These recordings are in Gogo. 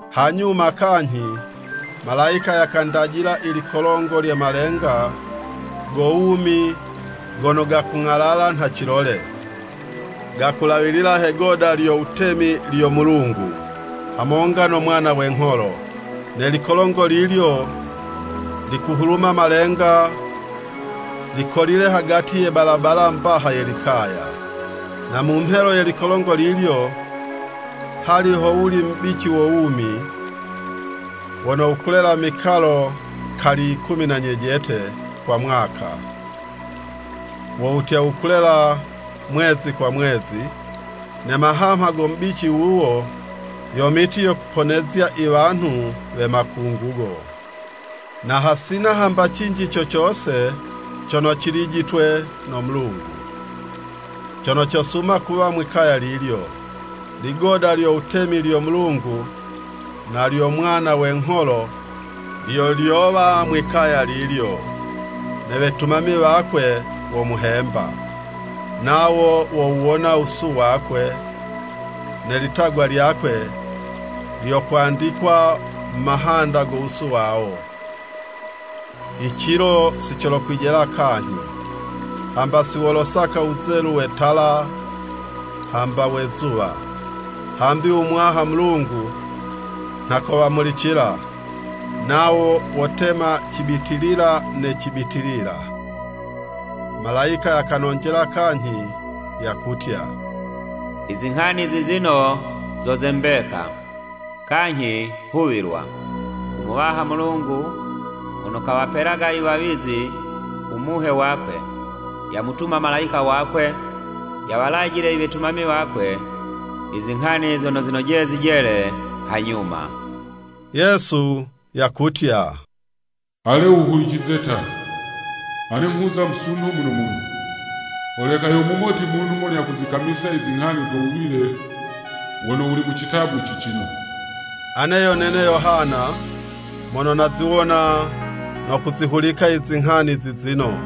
Hanyuma kanyhi malayika yakandajila i likolongo lye malenga go wumi gono gakung'alala nha cilole, gakulawilila he'goda lyo wutemi lyo Mulungu, hamonga no Mwana we ngholo. Ne likolongo lilyo likuhuluma malenga, likolile hagati ye balabala mbaha ye likaya. Na mu mhelo ye likolongo lilyo, hali howuli mubici wo wumi, wono wukulela mikalo kali yikumi na nyejete kwa mwaka, wo wutya wukulela mwezi kwa mwezi, ne mahamha go mubici wuwo, yo miti yo kuponezya i wanhu we makungugo. Na hasina hamba cinji co cose cono cilijitwe no Mulungu, cono cosuma kuwa mwikaya lilyo. Ligoda lyo wutemi lyo Mulungu na lyo Mwana we ngholo, lyo lyowa mwikaya lilyo, ne wetumami wakwe womuhemba. Nawo wowuwona wusu wakwe, ne litagwa lyakwe lyokwandikwa mu mahanda go wusu wawo. I cilo si colokwijela kanyhi, hamba si wolosaka wuzelu we tala hamba we'zuwa, hambi u Muwaha Mulungu nha kowamulicila, nawo wotema cibitilila ne cibitilila. Malayika yakanonjela kanyhi yakutya, “Izinghani zizino zo ze mbeka, kanyhi huwilwa. U Muwaha Mulungu mono kawapelaga i wawizi u Muhe wakwe, yamutuma malayika wakwe yawalajile i wetumami wakwe i zinghani zono zinojeye zijele hanyuma.” Yesu yakutya, “Ale wuhulicize ta! Ane nghuza musunho muno muno. Holeka yo mumoti munhu mono yakuzikamisa i zinghani zo wuwile wono wuli mu citabu cicino.” Ane yo nene Yohana, mono naziwona no kuzihulika i zinghani zizino.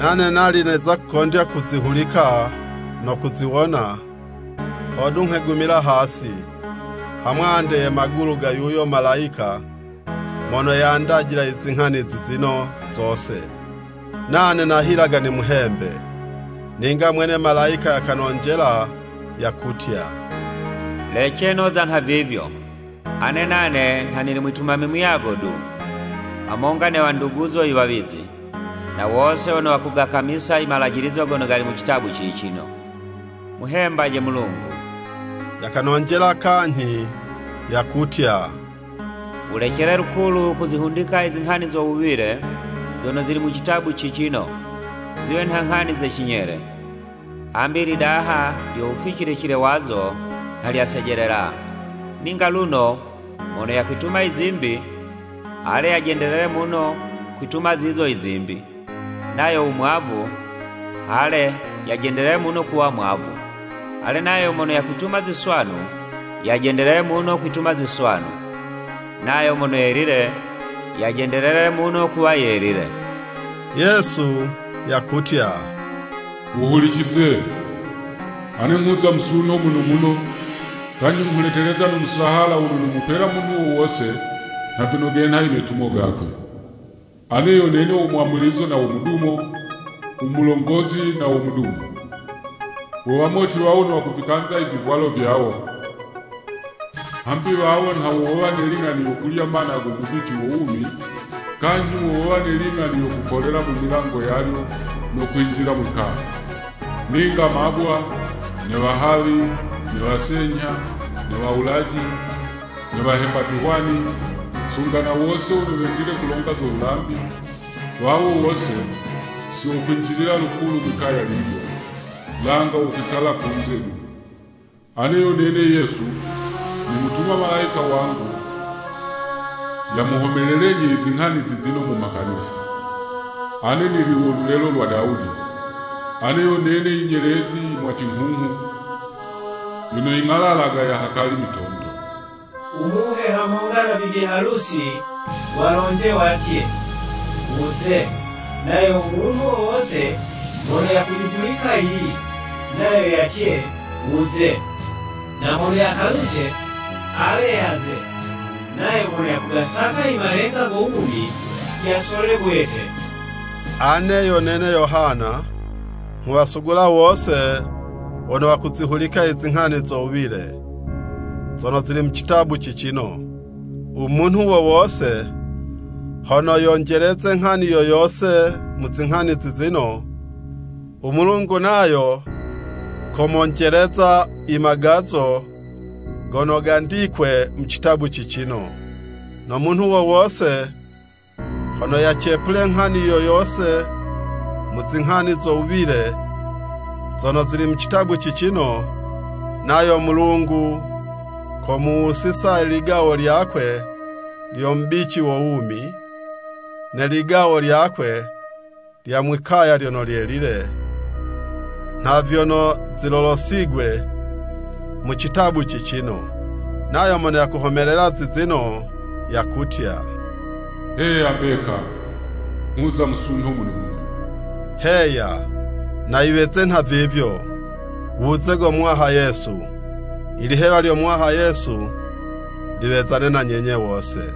Nane nali neza kukondya kuzihulika no kuziwona, hodu nghegumila hasi, ha mwande ye magulu ga yuyo malayika mono yandajila i zinghani zizino zose, nane nahilaga nimuhembe. Ninga mwene malayika yakanonjela yakutya, “Lece noza nhavivyo. Ane nane nha nili mwitumami muyago du, hamonga ne wanduguzo i wawizi, na wose wono wakugakamisa i malajilizo gono gali mu citabu cicino. Muhembaje Mulungu!” Yakanonjela kanyhi yakutya, “Wulecele lukulu kuzihundika i zinghani zo wuwile, zono zili mu citabu cicino, ziwe nha nghani ze cinyele, hambi i lidaha lyo wuficilicile wazo, nha lyasejelela. Ninga luno, mono yakwituma i zimbi, ale, yajendelele muno kwituma zizo i zimbi, nayo u mwavu, ale, yajendelele muno kuwa mwavu. Ale, nayo mono yakwituma ziswanu, yajendelele muno kwituma ziswanu. Nayo mono yelile, yajendelele muno kuwa yelile.” Yesu yakutya, “Wuhulicize! Ane nghuza musunho muno muno, kanyhi nghuleteleza no musahala wono nomupela munhu wo wose nha vyono genha i metumo gakwe. Ane yo nene wo Mwamulizo na wo Mudumo, u Mulongozi na wo Mudumo.” Wo wamoti wawo wono wakuvikanza i vivwalo vyawo, hambi wawo nha wo wowa ne ling'ani yo kulya mana go mubici wo wumi, kanyhi wo wowa ne ling'ani yo kukolela mu milango yalyo, no kwinjila mwi'kaya. Ninga mabwa, ne wahawi, ne wasenyha, ne wawulaji, ne wahemba vihwani, sunga na wose wono wendile kulonga zo wulambi, wawo wose, si wokwinjilila lukulu mwi'kaya lilyo, langa wokwikala kunze du. Ane yo nene Yesu, nimutuma malayika wangu, yamuhomelelenyi i zinghani zizino mu makanisa. Ane nili wo lulelo lwa Dawudi: Ane yo nene i nyelezi i mwacinghunghu, yono ying'alalaga ya hakali mitondo! U Muhe hamonga na bibi halusi walonje watye, “Wuze!” Nayo u munhu wo wose mono yakuyihulika yiyi, nayo yatye, “Wuze!” Na mono yakaluce, ale yaze, nayo mono yakugasaka i malenga go wumi, yasole bwete. Ane yo nene Yohana, nghuwasugula wose wono wakuzihulika i zinghani zo wuwile, zono zili mu citabu cicino, u munhu wo wose hono yonjeleze nghani yo yose mu zinghani zizino, u Mulungu nayo komonjeleza i magazo gono gandikwe mu citabu cicino. No munhu wo wose hono yacepule nghani yo yose mu zinghani zo wuwile zono zili mu citabu cicino, nayo Mulungu komuwusiza i ligawo lyakwe lyo mubici wo wumi, ne ligawo lyakwe lya mwikaya lyono lyelile, nha vyono zilolosigwe mu citabu cicino. Nayo mono yakuhomelela zizino, yakutya, “Heya, mbeka! Nghuza musunho muno muno.” Heya. Na yiweze nha vivyo! Wuze go Muwaha Yesu! Ilihewa lyo Muwaha Yesu, liwezane na nyenye wose.